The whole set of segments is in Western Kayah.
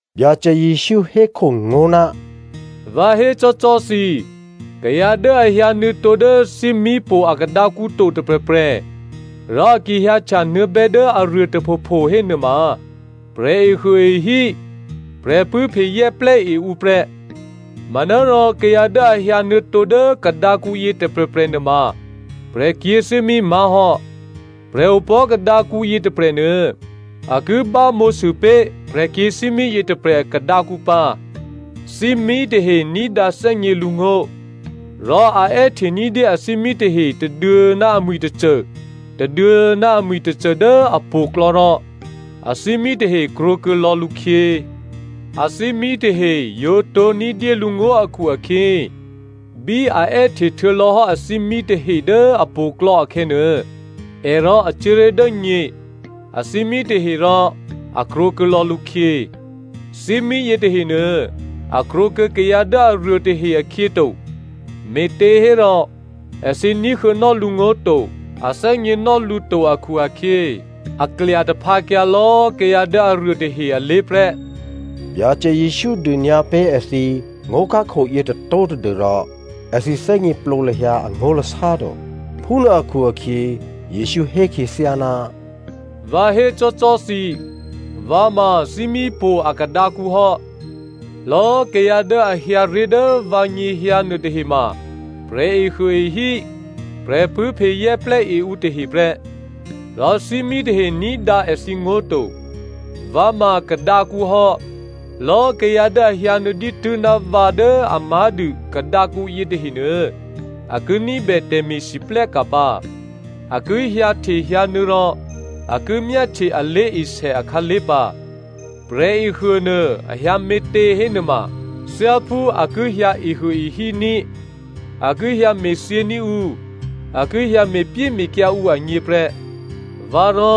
Byacè Jesǔ hékhongó̤, “Vǎ hécò́cò́ thǐ, kayǎ dố a hyǎnuô̌tǒ dố thímípo̤ a kadǎkǔ to tôprè̤prè̤, rò a ki hyǎhtya nuô̌bè́ dố aruô tôphopho hénuôma, prè̤ehuôehí, prè̤pṳ̂́phe zè́plè́e ǔ prè́. Manárò kayǎ dố a hyǎ nuô̌tǒ dố kadǎkǔyě tôprè̤prè̤ nuôma prè̤kyě̤thímí má̤ hò́. Prè̤opò̤́ kadǎkǔ yětôprè̤nuô, a ki bámǒsû pé̤ prè̤kyě̤thímí yětôprè̤ kadǎkǔ pǎ. Thímí tahe ní̤dǎ thè́gně lǔngó̤. Rò a è́hte ní̤dyé athímí tahe tôduô̌ ná amwi̤ tôcô, tôduô̌ ná amwi̤ tôcô dố apo̤klò̌ rò athímí tahe krwǒkuô̌ lò̌ lǔkhyě. Athímí tahe yǒ tǒ̤ní̤ dyé lǔngó̤ akhu-akhyě, bí a è́hte htuô̌lò̌ hò́ athímí tahe dố apo̤klò̌ akhè̌nuô, è rò a cuố ré̤ dố nyě, athímí tahe rò a krwǒkuô̌ lò̌ lǔkhyě. Thímí yětahenuô, a krwǒkuô̌ kayǎ dố aruôtahe akhyěto, me̤těhérò èthǐ ní̤huô̌nò́ lǔngó̤ to, a thè́gněnò́ lǔ to akhu-akhyě, a klya taphǎkyǎ lò̌꤮ kayǎ dố aruô tahe alé̤ prè́.” Byacè Jesǔ dônyǎ pé̤ èthǐ ngó̤khákho yětôtó̤ tadû́rò èthǐ thè́gněplǒ lahyǎ angó̤lasá to. Phúnuô akhu-akhyě, Jesǔ hé khyěthyá, “Vǎ hécò́cò́ thǐ, vǎ ma thímípo̤ a kadǎkǔ hò́. Lò̌꤮ kayǎ dố a hyǎ ré̤ dố vǎnyěhyǎ nuôtahe ma, prè̤ehuôehí, prè̤pṳ̂́phe zè́plè́e ǔ tahe prè́. Rò thímí tahe ní̤dǎ èthǐ ngó̤ to. Vǎ ma kadǎkǔ hò́. Lò̌꤮ kayǎ dố a hyǎnuô̌ dǐtû́ ná vǎ dố a má̤dû kadǎkǔ yětahe nuô, a ki ní̤bè tè̤me̤lwóhteka̤ pǎ. A ki hyǎhte hyǎnuô̌ rò a ki myáhtye a lé̤esè akhǎlé̤ pǎ. Prè̤ehuônuô a hyǎme̤tě hénuôma, thyáphú a ki hyǎ ehuôehí ní̤, a ki hyǎ me̤thyění̤ ǔ, a ki hyǎ me̤pyéme̤kyǎ ǔ agněprè́. Vǎ rò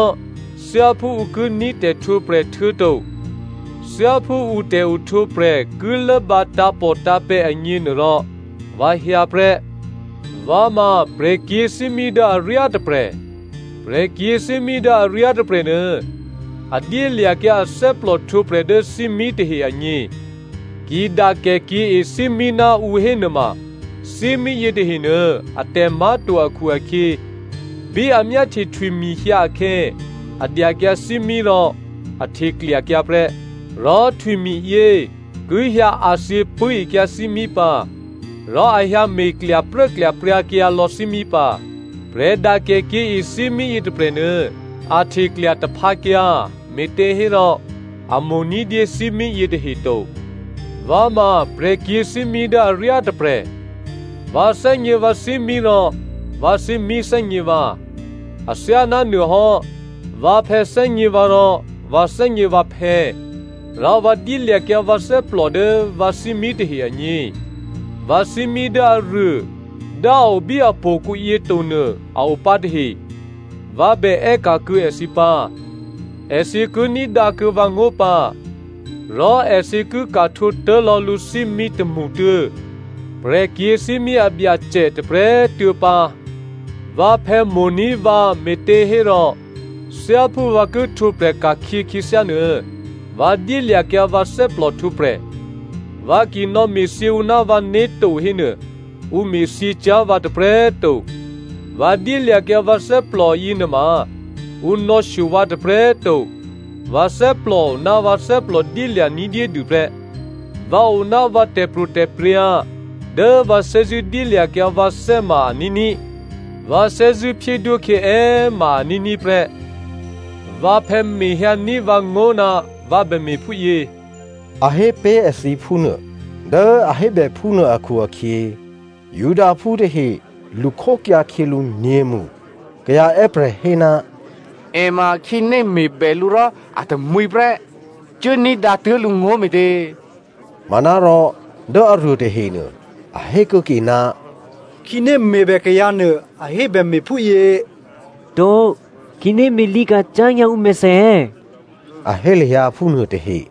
thyáphú ǔ ki ní̤ tè̤htwǒprè̤ htuô̌to thyáphú ǔ tè̤ohtwǒprè̤ ki lốbǎ tǎ̤pòtǎ̤pè̤̌ agně nuôrò vǎ hyǎ prè́. “Vǎ ma prè̤kyě̤thímí dố aryá tôprè̤. Prè̤kyě̤thímí dố aryá tôprè̤nuô a dyélya̤kyǎ athè́plò htwǒprè̤ dố thímí tahe agně. Ki dakèkyě̤e thímí ná ǔ hénuôma, thímí yětahenuô atè̤ má̤to akhu-akhyě, bí a myáhtye htwimi̤ hyǎ akhè̌, a dyakyǎ thímí rò a hteklyakyǎ prè́. Rò htwimi̤yě ki hyǎ a̤thyě pṳ̂́ekyǎ thímí pǎ, rò a hyǎ me̤ klyapruố klyapryǎkyǎ lò̌ thímí pǎ. Prè̤ dakèkyě̤e thímí yětôprè̤nuô, a hteklya taphǎkyǎ, me̤těhérò a mo̤ ní̤dyé thímí yětahe to. “Vǎ ma prè̤kyě̤thímí dố aryá tôprè̤. Vǎ thè́gně vǎ thímí rò vǎ thímí thè́gně vǎ. Athyáná nuôhò́, vǎphè̌ thè́gně vǎ rò vǎ thè́gně vǎphè̌, rò vǎ dyélya̤kyǎ vǎ thè́plò dố vǎ thímí tahe agně. Vǎ thímí dố aruô dố a o bí apo̤kǔ yětonuô a opǎ tahe. Vǎ bè è́ka̤ kuô̌ èthǐ pǎ. Èthǐ ki ní̤dǎkuô̌ vǎ ngó̤ pǎ, rò èthǐ ki ka̤ htwǒ tố̤ lò̌ lǔ thímí tômṳtuô̌, prè̤kyě̤thímí a Byacè tôprè̤꤮ tuô̌ pǎ. Vǎphè̌ mo̤ní̤ vǎ me̤těhérò thyáphú vǎ ki htwǒprè̤ ka̤khyě khyěthyá nuô, vǎ dyélya̤kyǎ vǎ thè́plò htwǒprè̤. Vǎ ki nò̌me̤thyě ǔ ná vǎné̤ to hénuô, ǔ me̤thyě cyá̤ vǎ tôprè̤꤮ to. Vǎ dyélya̤kyǎ vǎ thè́plò yěnuôma, ǔ nò̌shyo vǎ tôprè̤꤮ to, vǎ thè́plò ná vǎ thè́plò dyélya̤ ní̤dyédû prè́. Vǎ o ná vǎ tè̤pro̤tè̤prya̤ dố vǎ thè́zṳ̂́ dyélya̤kyǎ vǎthè́ ma a ní̤ní̤, vǎ thè́zṳ̂́ phyédwókhyě è ma꤮ a ní̤ní̤ prè́. Vǎphè̌ mehyǎní̤ vǎ ngó̤ ná vǎ bème̤ phúyě,” a hé pé̤ èthǐ phúnuô. Dố a hébè phúnuô akhu-akhyě, Judaphú tahe lṳkhókyǎ khyělǔ nyě̤mṳ. Kayǎ è́prè̤ hé, “È ma khǐné me̤bè lǔ rò a tamwǐ prè́. Cuố ní̤dǎ tuố̤ lǔngó̤ me̤tě?” Manárò dố aruô tahenuô a hé kuô̌ke, “Khǐné me̤bè kayǎnuô a hébè me̤phúyě to. Khǐné me̤lǐka̤ cyá̤ nyǎ ǔmèthè è̌?” A hé lahyǎ phúnuô tahe.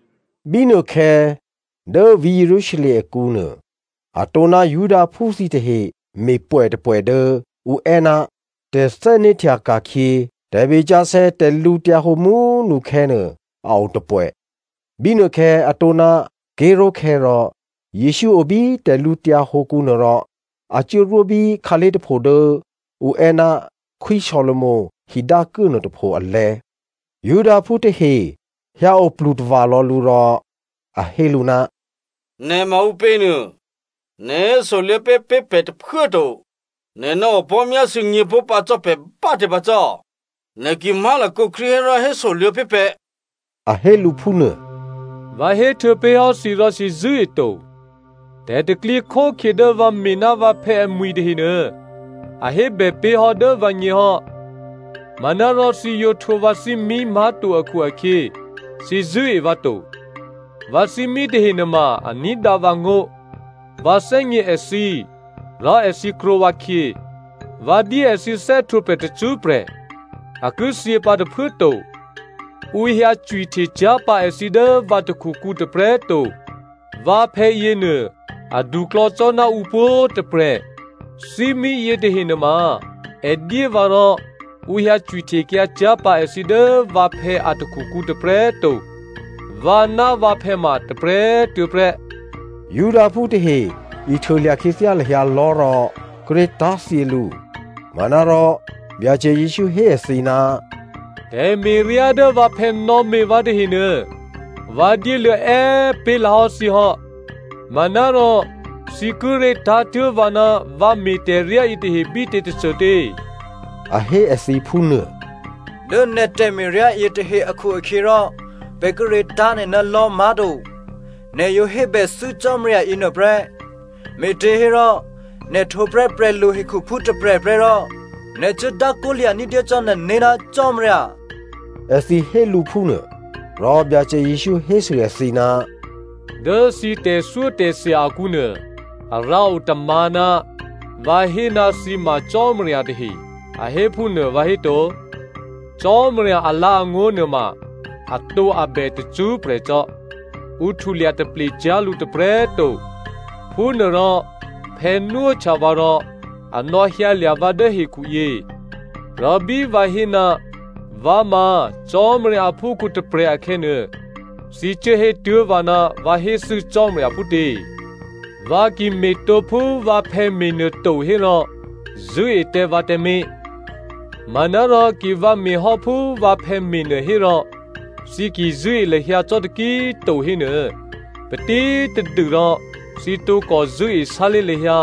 Bínuôkhè̌ dố vǐ̤ Jerusalem akǔnuô, a tǒná Judaphú thǐtahe me̤ pwè̌ tôpwè̌ dố ǔ è́ ná tè̤thè́né̤htya ka̤khyě tè̤be sǎsè̌ tè̤lǔhǒdu mú꤮ nukhè̌ nuô, a o tôpwè̌. Bínuôkhè̌ a tǒná ké̤ró̤khè̌ rò Jesǔ o bí tè̤lǔtyǎ hǒkǔnuô rò a cuốrwó bí khǎlé̤ tôpho dố ǔ è́ ná Khwí Solomo hidǎkuố nuôtôpho alè̤̌. Judaphú tahe hyǎ oplu tava̤lò̌ lǔ rò a hé lǔ, “Nè̤ ma ǔpě nuô nè̤ hésoluô̌pé̤ pé̤ pè̤ tôphuố꤮ to, nè̤ nò̌opò̤́ myásû̌ nyě̤pó̤ pǎ cò́ pè̤ bá꤮ tě pǎ cò́? Nè̤ ki má̤lakǒ Krístu hérò hésoluô̌ pé̤ pè̤,” a hé lǔ phúnuô. “Vǎ héhtuô̌ pé̤ hò́ thǐ rò thǐ zṳ̂́eto. Tè̤pro̤tè̤prya̤ dố vǎ me̤ ná vǎphè̌ amwi̤ tahenuô, a hébè pé̤hò́ dố vǎgně hò́. Manárò thǐ yǒ htwǒ vǎ thímí má̤to akhu-akhyě, thǐ zṳ̂́e vǎ to. Vǎ thímí tahe nuôma a ní̤dǎ vǎ ngó̤. Vǎ thè́gně èthǐ, rò èthǐ krwǒ vǎkhyě. Vǎ dyé èthǐ thè́htwǒprè̤ tacṳ́prè̤. A ki thyě pǎ tôphuố꤮ to. Ǔ hyǎ cwihte cyá̤ pǎ èthǐ dố vǎ takhukǔ tôprè̤꤮ to. Vǎphè̌ yěnuô aduklò̌ cò́ ná ǔ pwǒ̤꤮ tôprè̤. Thímí yětahe nuôma è dyé vǎ rò ǔ hyǎ cwihtekyǎ cyá̤ pǎ èthǐ dố vǎ phè̌ a takhukǔ tôprè̤꤮ to. Vǎ ná vǎphè̌ ma tôprè̤꤮ tuô̌ prè́.” Judaphú tahe ihtuôlya̤ khyěthyá lahyǎ lò̤́ rò kíré̤ tá̤thyě lǔ. Manárò Byacè Jesǔ hé èthǐ, “Tè̤me̤ryá dố vǎphè̌ nò̌me̤ vǎ tahenuô, vǎ dyéluô̌ è́꤮ pé̤lǎhò́ thǐ hò́. Manárò thǐ kíré̤ tá̤tuố̤ vǎ ná vǎ me̤ tè̤ryá yětahe bítě tôcôtě?” A hé èthǐ phúnuô. “Dố nè̤ tè̤me̤ryá yětahe akhu-akhyěrò pè̤ kíré̤ tá̤ nè̤ ná lò̤́ má̤to. Nè̤ yǒ hébèthû́ Cò́marya yěnuô prè́, me̤těhérò nè̤ htwǒ prè́ prè̤lu hekhuphú tôprè̤prè́ rò nè̤ cuố dákwó lya̤ ní̤dyé cò́ nè̤né̤ ná Cò́marya,” èthǐ hé lǔ phúnuô. Rò Byacè Jesǔ hésû èthǐ, “Dố thǐ tè̤thyótè̤thya akǔ nuô, a rǎo tômǎ̤, ‘Vǎ hé ná thǐ ma cò́marya tahe,’ a hé phúnuô vǎhéto? Cò́marya alǎ̤angó̤ nuôma atǒabè tacṳ́prè̤ cò́. Ǔ htulya taple cyá̤ lǔ tôprè̤꤮ to. Phúnuôrò phè̌ nwóhtya vǎ rò a nò̌hyǎlya̤ vǎ dố hekhuyě. Rò bí vǎ hé, ‘Vǎ ma Cò́marya aphúkhǔ tôprè̤’ akhè̌nuô, thǐ cuố hétuố̤ vǎ ná vǎ héthû́ Cò́marya phútě? Vǎ ki me̤tǒ phú vǎphè̌ me̤nuô to hérò zṳ̂́e tǎ vǎ tǎmé̤. Manárò ki vǎ me̤hò́ phú vǎphè̌ me̤nuô hérò thǐ ki zṳ̂́e lahyǎ cò́ taki꤮ to hénuô, patítadû rò thǐ tǒkò zṳ̂́e sálé̤ lahyǎ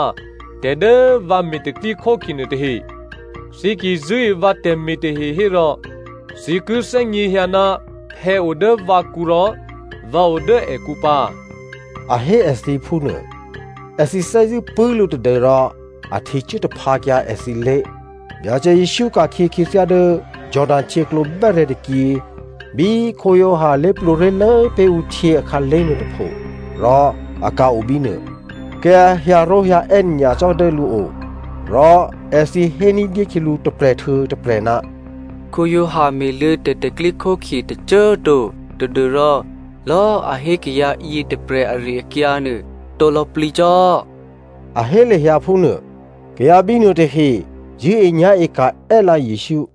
tè̤ dố vǎ me̤ tè̤pro̤tè̤prya̤ nuôtahe. Thǐ ki zṳ̂́e vǎ tè̤me̤ tahe hérò thǐ ki thè́gněhyǎ ná phè̌o dố vǎkǔ rò vǎ odố èkǔ pǎ,” a hé èthǐ phúnuô. Èthǐ thè́zṳ̂́ pṳ̂́ lǔ tadû́rò a htecuố taphǎkyǎ èthǐlé̤. Byacè Jesǔ ka̤khyě khyěthyá dố Jordano htyěklǒ bè́rè̤̌ tôkyě, bí Giovanni lé̤plwǒ ré̤lố pé̤ ǔ htyě akhǎlé̤ nuôtôpho, rò a ka̤-o bínuô. Kayǎ hyǎró̤hyǎè́ nyacò́ dố lǔo. Rò èthǐ hé ní̤dyé khyělǔ tôprè̤ htuô̌ tôprè̤, “Giovanni me̤luô̌ tè̤pro̤tè̤prya̤ tôcô꤮ to tadû́rò lò̌꤮ a hé kayǎ yětôprè̤ ari-akyǎ nuô, atǒ lò̌plǐcò́,” a hé lahyǎ phúnuô. Kayǎ bínuôtahe zṳ̂́enyá̤e ka̤ è́lǎ Jesǔ.